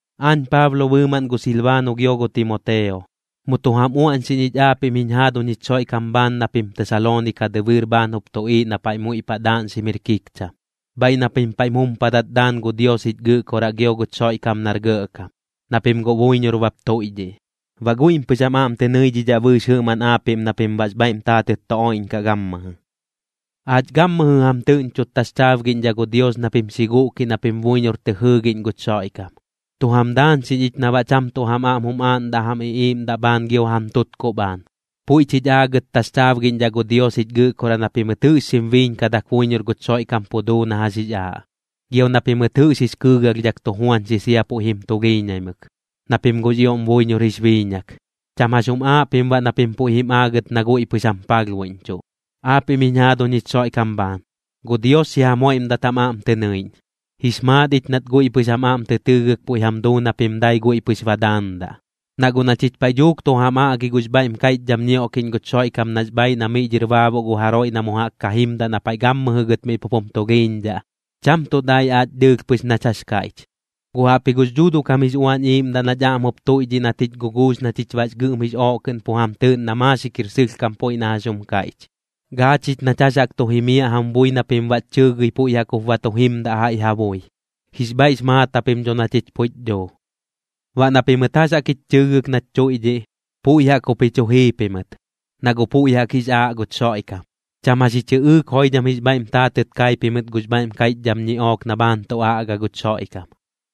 Aañ Paablo bɨɨmaꞌn gu Silbaano gio gu Timoteo, mu tu jam uaꞌñxiꞌñ ich aapiꞌm jiñ jaaduñ jich Xoiꞌkam bhaan na pim Tesaloonika dɨbɨɨr bhaan jup tuꞌiiꞌ na paiꞌ muiꞌ paꞌ daaꞌñxim jir kikcham, bhaiꞌ na pim paiꞌm jumpadat daan gu Dios jich Gɨꞌkoraꞌ gio guch Xoiꞌkam nar Gɇꞌkam, na pim guꞌ buiñor bap tuiꞌdhiꞌ. Baꞌ guiꞌm pɨx jam aꞌm tɨ nɨidhidhaꞌ bɨɨx jɨꞌmaꞌn aapiꞌm na pim baꞌx bhaiꞌm taatɨt tu oiꞌñkaꞌ gammɨjɨ. Aach gammɨjɨ jam tɨꞌñchot taxchaabgiꞌñdhaꞌ gu Dios na pim xi guꞌkiꞌ na pim buiñor tɨ jɨɨgiꞌñ guch Xoiꞌkam, tu jam daañxiꞌñ ich na baꞌ cham tuꞌ jam aꞌm jum aaꞌndaꞌ jam iꞌiiꞌmdaꞌ bhaan gio jam tutkuꞌ bhaan. Puiꞌch jich aagɨt taxchaabgiꞌñdhaꞌ gu Dios jich Gɨꞌkoraꞌ na pimɨt jɨꞌx xim biiñkadak buiñor guch Xoiꞌkam pu duu na jax jix aaꞌ, gio na pimɨt jɨꞌx jix kɨɨgalhdhak tu juañxi sia puiꞌ jim tulhiiñaimɨk, na pim guꞌx ioꞌm buiñor jix biiñak. Cham jax jum aaꞌ pim baꞌ na pim puiꞌ jim aagɨt na guiꞌ pɨx jam palhbuiꞌñchuꞌ. Aapiꞌm jiñ jaaduñ jich Xoiꞌkam bhaan, gu Dios xi jam joiꞌmdat jam aꞌm tɨ nɨiꞌñ. Jix maat ich nat guiꞌ pɨx jam aꞌm tɨ tɨɨgɨk puiꞌ jam duu na pim dai guiꞌ pɨx ba daandaꞌ. Na guꞌ na chich paiꞌ dhuuk tu jam aꞌgi gux bhaiꞌm kaiꞌchdham ñioꞌkiꞌñ guch Xoiꞌkam nax bhaaiꞌ na miꞌ dhɨr baabuꞌ gu jaroiꞌ na mu jaꞌk ka jimdaꞌ na paiꞌ gammɨjɨ gɨt miꞌ pup jum tulhiiñdhaꞌ, cham tuꞌ dai aach dɨɨlh pɨx nach jax kaiꞌch, guꞌ jaꞌpji gux Dhuuduꞌ kam jix Uañ Iiꞌmdaꞌ nach aꞌm jup tuiꞌdhiꞌ nat jich guguux na chich baꞌx gɨꞌm jix ooꞌ kɨꞌn pu jam tɨɨꞌn na maaxik jir sɨlhkam puiꞌ na jax jum kaiꞌch. Gaa chich nach jax jaꞌk tu jimiaꞌ jam bui na pim baꞌch chɨɨgɨi puiꞌ jaꞌk jup ba tu jimdaꞌ jaiꞌ ja bui. Jix bhaiꞌx maat japim dho na chich puiꞌch dhuu. Baꞌ na pimɨt jax jaꞌk jich chɨɨgɨk nach tuiꞌdhiꞌ, puiꞌ jaꞌk jup ji chu jii pimɨt, na guꞌ puiꞌ jaꞌk jix aaꞌ guch Xoiꞌkam. Cham jax ji chɨꞌɨɨk joidham jix bhaiꞌm taatɨt kai pimɨt gux bhaiꞌm kaiꞌchdham ñiꞌook na bhaan tu aꞌga guch Xoiꞌkam,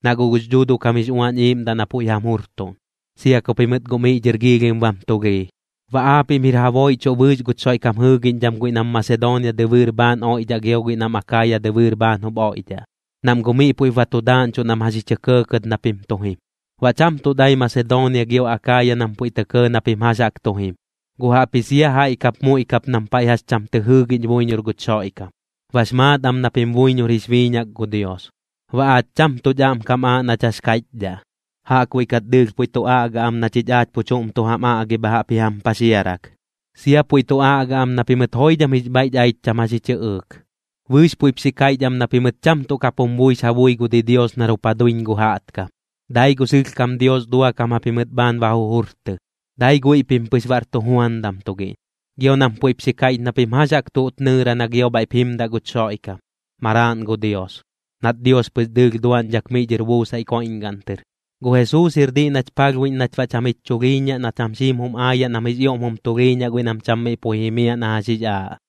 na guꞌ gux Dhuuduꞌ kam jix Uañ Iiꞌmdaꞌ na puiꞌ jam jurtuꞌn, sia ku pimɨt guꞌ miꞌ dhɨr giilhim bam tulhii. Baꞌ aapiꞌm jir ja booiꞌchuꞌ bɨɨx guch Xoiꞌkam jɨɨgiꞌñdham guiꞌ nam Masedoonia dɨbɨɨr bhaan oiꞌdhaꞌ gio guiꞌ nam Akaaya dɨbɨɨr bhaan jup oiꞌdhaꞌ, nam guꞌ miꞌ puiꞌp ba tu daaꞌñchuꞌ nam jax ji chɇ kɇɇkɇt na pim tu jim. Baꞌ cham tuꞌ dai Masedoonia gio Akaaya nam puiꞌ tɇ kɇɇ na pim jax jaꞌk tu jim, guꞌ jaꞌpji sia jaiꞌ kap muiꞌ kap nam paiꞌ jax cham tɨ jɨɨgiꞌñ buiñor guch Xoiꞌkam, bax maat am na pim buiñor jix biiñak gu Dios. Baꞌ aach cham tuꞌch aꞌm kam aaꞌ nach jax kaiꞌchdhaꞌ, jaꞌkbuiꞌ kat dɨɨlh puiꞌ tu aꞌga am na chich aach pu chuꞌm tu jam aꞌgi bha jaꞌp ji jam paxiarak. Sia puiꞌ tu aꞌga am na pimɨt joidham jix bhaiꞌch aich cham jax ji chɨꞌɨɨk. Bɨɨx puiꞌp xi kaiꞌch am na pimɨt cham tuꞌ kap jum buix ja bui gu didios nar jup ja duiñ gu jaꞌtkam, dai gu sɨlhkam Dios duakam japimɨt bhaan ba jujurtɨ, dai guiꞌ pim pɨx bar tujuandam tugiꞌñ. Gio nam puiꞌp xi kaiꞌch na pim jax jaꞌk tuꞌt nɨɨra na gio bhaiꞌp jimdaꞌ guch Xoiꞌkam, Maraaꞌn gu Dios, nat Dios pɨx dɨɨlh duaꞌñdhak miꞌ dhɨr buusaiꞌ koiꞌñgaꞌn tɨr. Gu Jesuus jir diꞌ nach palhbuiꞌñ nach baꞌ cham jich chulhiiñaꞌ na cham xiim jum aayaꞌ nam jix ioꞌm jum tulhiiñaꞌ guiꞌ nam cham miꞌ puiꞌ jimiaꞌ na jax jix aaꞌ.